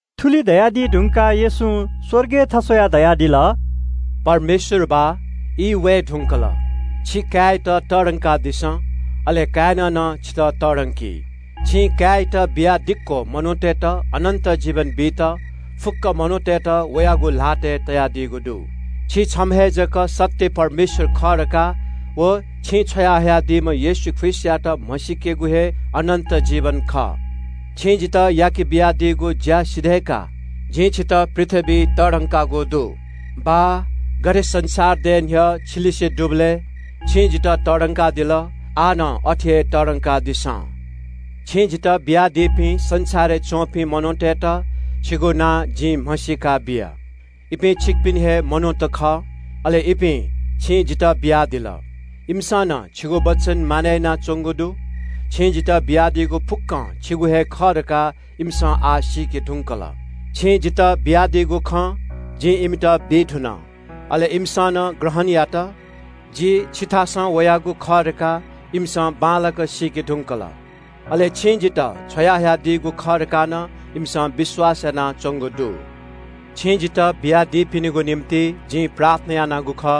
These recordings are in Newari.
थुलि धयादी धुंकाः येशूं स्‍वर्गय् थस्‍वयाः धयादिल – “बाः, ई वये धुंकल, छि काय्‌यात तःधंकादिसँ, अले काय्‌नं नं छितः तःधंकी। छिं काय्‌यात बियादिक्‍व मनूतय्‌त अनन्‍त जीवन बीत फुक्‍क मनूतय्‌त वयागु ल्‍हातय् तयादीगु दु। छि छम्‍ह हे जक सत्‍य परमेश्‍वरयात व छिं छ्वयाहयादीम्‍ह येशू ख्रीष्‍टयात म्‍हसीकेगु हे अनन्‍त जीवन खः। छिं जितः याके बियादीगु ज्‍या सिधय्‌काः जिं छितः पृथ्‍वीइ तःधंकागु दु। बाः, गथे संसार दये न्‍ह्यः छिलिसे दुबलय् छिं जितः तःधंकादिल, आः नं अथे हे तःधंकादिसँ।” “छिं जितः बियादीपिं संसारय् च्‍वंपिं मनूतय्‌त छिगु नां जिं म्‍हसीका बिया। इपिं छिकपिनि हे मनूत खः, अले इपिं छिं जितः बियादिल। इमिसं नं छिगु वचन मानय् यानाच्‍वंगु दु। छिं जितः बियादीगु फुक्‍कं छिगु हे खः धकाः इमिसं आः सीके धुंकल। छिं जितः बियादीगु खँ जिं इमित बी धुन। अले इमिसं नं ग्रहण यात। जि छिथासं वयागु खः धकाः इमिसं बांलाक सीके धुंकल, अले छिं जितः छ्वयाहयादीगु खः धकाः नं इमिसं विश्‍वास यानाच्‍वंगु दु। “छिं जितः बियादीपिनिगु निंतिं जिं प्रार्थना यानागु खः,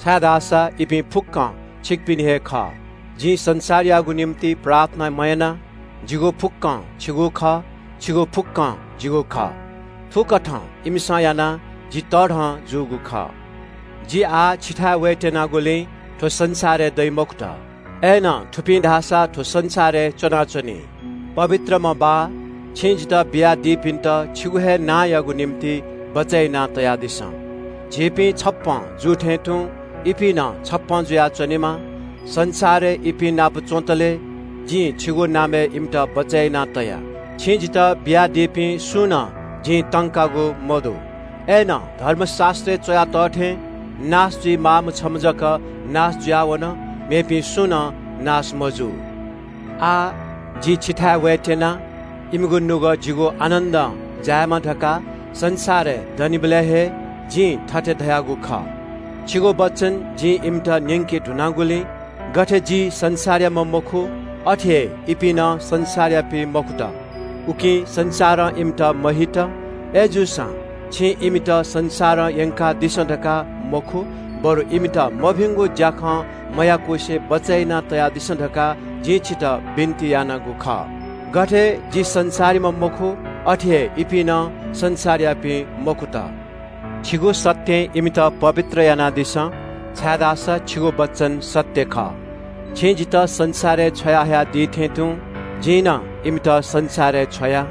छाय्‌धाःसा इपिं फुक्‍कं छिकपिनि हे खः। जिं संसारयागु निंतिं प्रार्थना मयाना। जिगु फुक्‍कं छिगु खः, छिगु फुक्‍कं जिगु खः। थुकथं इमिसं यानाः जि तःधं जूगु खः। जि आः छिथाय् वयेत्‍यनागुलिं थ्‍व संसारय् दइ मखुत, थुपिं धाःसा थ्‍व संसारय् च्‍वनाच्‍वनी। पवित्रम्‍ह बाः, छिं जितः बियादीपिन्‍त छिगु हे नांयागु निंतिं बचय् यानातयादिसँ। झीपिं थें तुं इपिं नं छप्‍पँ जुयाच्‍वनेमा। संसारय् इपिं नाप च्‍वंतले जिं छिगु नामय् इमित बचय् याना तया। छिं जितः बियादीपिं सुं नं जिं तंकागु मदु। अय्‌नं धर्मशास्‍त्रय् च्‍वया तः थें नाश जुइमाःम्‍ह छम्‍ह जक नाश जुयावन, मेपिं सुं नं नाश मजू। “आः जि छिथाय् वयेत्‍यना। इमिगु नुगः जिगु आनन्‍दं जायेमा धकाः संसारय् दनिबलय् हे जिं थथे धयागु खः। छिगु वचन जिं इमित न्‍यंके धुनागुलिं गथे जि संसारयाम्‍ह मखु, अथे हे इपिं नं संसारयापिं मखुत, उकिं संसारं इमित हेला यात। अय्‌जूसां छिं इमित संसारं यंकादिसँ धकाः मखु बरु इमित मभिंगु ज्‍याखँ मयाकुसे बचय् यानातयादिसँ धकाः जिं छितः बिन्‍ति यानागु खः। गथे जि संसारयाम्‍ह मखु, अथे हे इपिं नं संसारयापिं मखुत। छिगु सत्‍यं इमित पवित्र यानादिसँ, छाय्‌धाःसा छिगु वचन सत्‍य खः। छिं जितः संसारय् छ्वया हयादीथें तुं जिं नं इमित संसारय् छ्वया।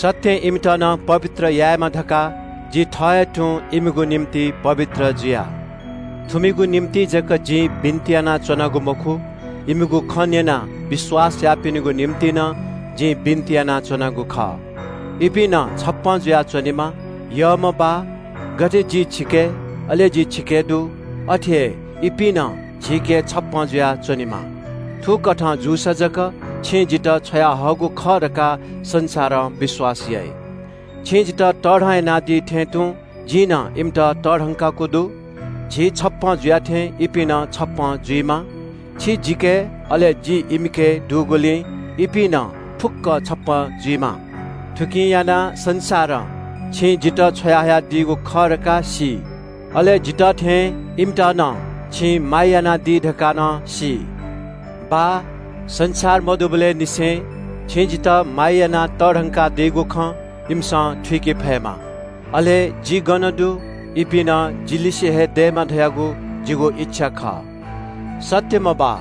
सत्‍यं इमित नं पवित्र यायेमा धकाः जि थः हे तुं इमिगु निंतिं पवित्र जुया।” “थुमिगु निंतिं जक जिं बिन्‍ति यानाच्‍वनागु मखु, इमिगु खँ न्‍यनाः विश्‍वास याःपिनिगु निंतिं नं जिं बिन्‍ति यानाच्‍वनागु खः। इपिं नं छप्‍पँ जुयाच्‍वनेमा। यःम्‍ह बाः, गथे छि जिके, अले जि छिके दु, अथे हे इपिं नं झीके छप्‍पँ जुयाच्‍वनेमा। थुकथं जूसा जक छिं जितः छ्वयाहःगु खः धकाः संसारं विश्‍वास याइ। “छिं जितः तःधं यानादी थें तुं जिं नं इमित तःधंकागु दु। झी छप्‍पँ जुया थें इपिं नं छप्‍पँ जुइमा। छि जिके, अले जि इमिके दुगुलिं इपिं नं फुक्‍क छप्‍पँ जुइमा। थुकिं यानाः संसारं छिं जितः छ्वयाहयादीगु खः धकाः सी, अले जितः थें इमित नं छिं माया यानादी धकाः नं सी।” “बाः, संसार मदुनिबलय् निसें छिं जितः माया यानाः तःधंकादीगु खँ इमिसं थुइके फयेमा, अले जि गन दु, इपिं नं जि लिसे हे दयेमा धयागु जिगु इच्‍छा खः। “सत्‍यम्‍ह बाः,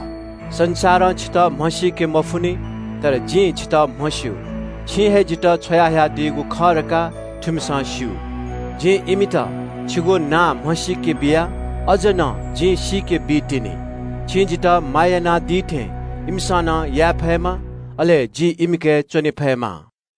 संसारं छितः म्‍हसीके मफुनि। तर जिं छितः म्‍हस्‍यू। छिं हे जितः छ्वयाहयादीगु खः धकाः थुमिसं स्‍यू। जिं इमित छिगु नां म्‍हसीके बिया। अझ नं जिं सीके बीतिनि। छिं जितः माया यानादी थें इमिसं नं याये फयेमा, अले जि इमिके च्‍वने फयेमा।”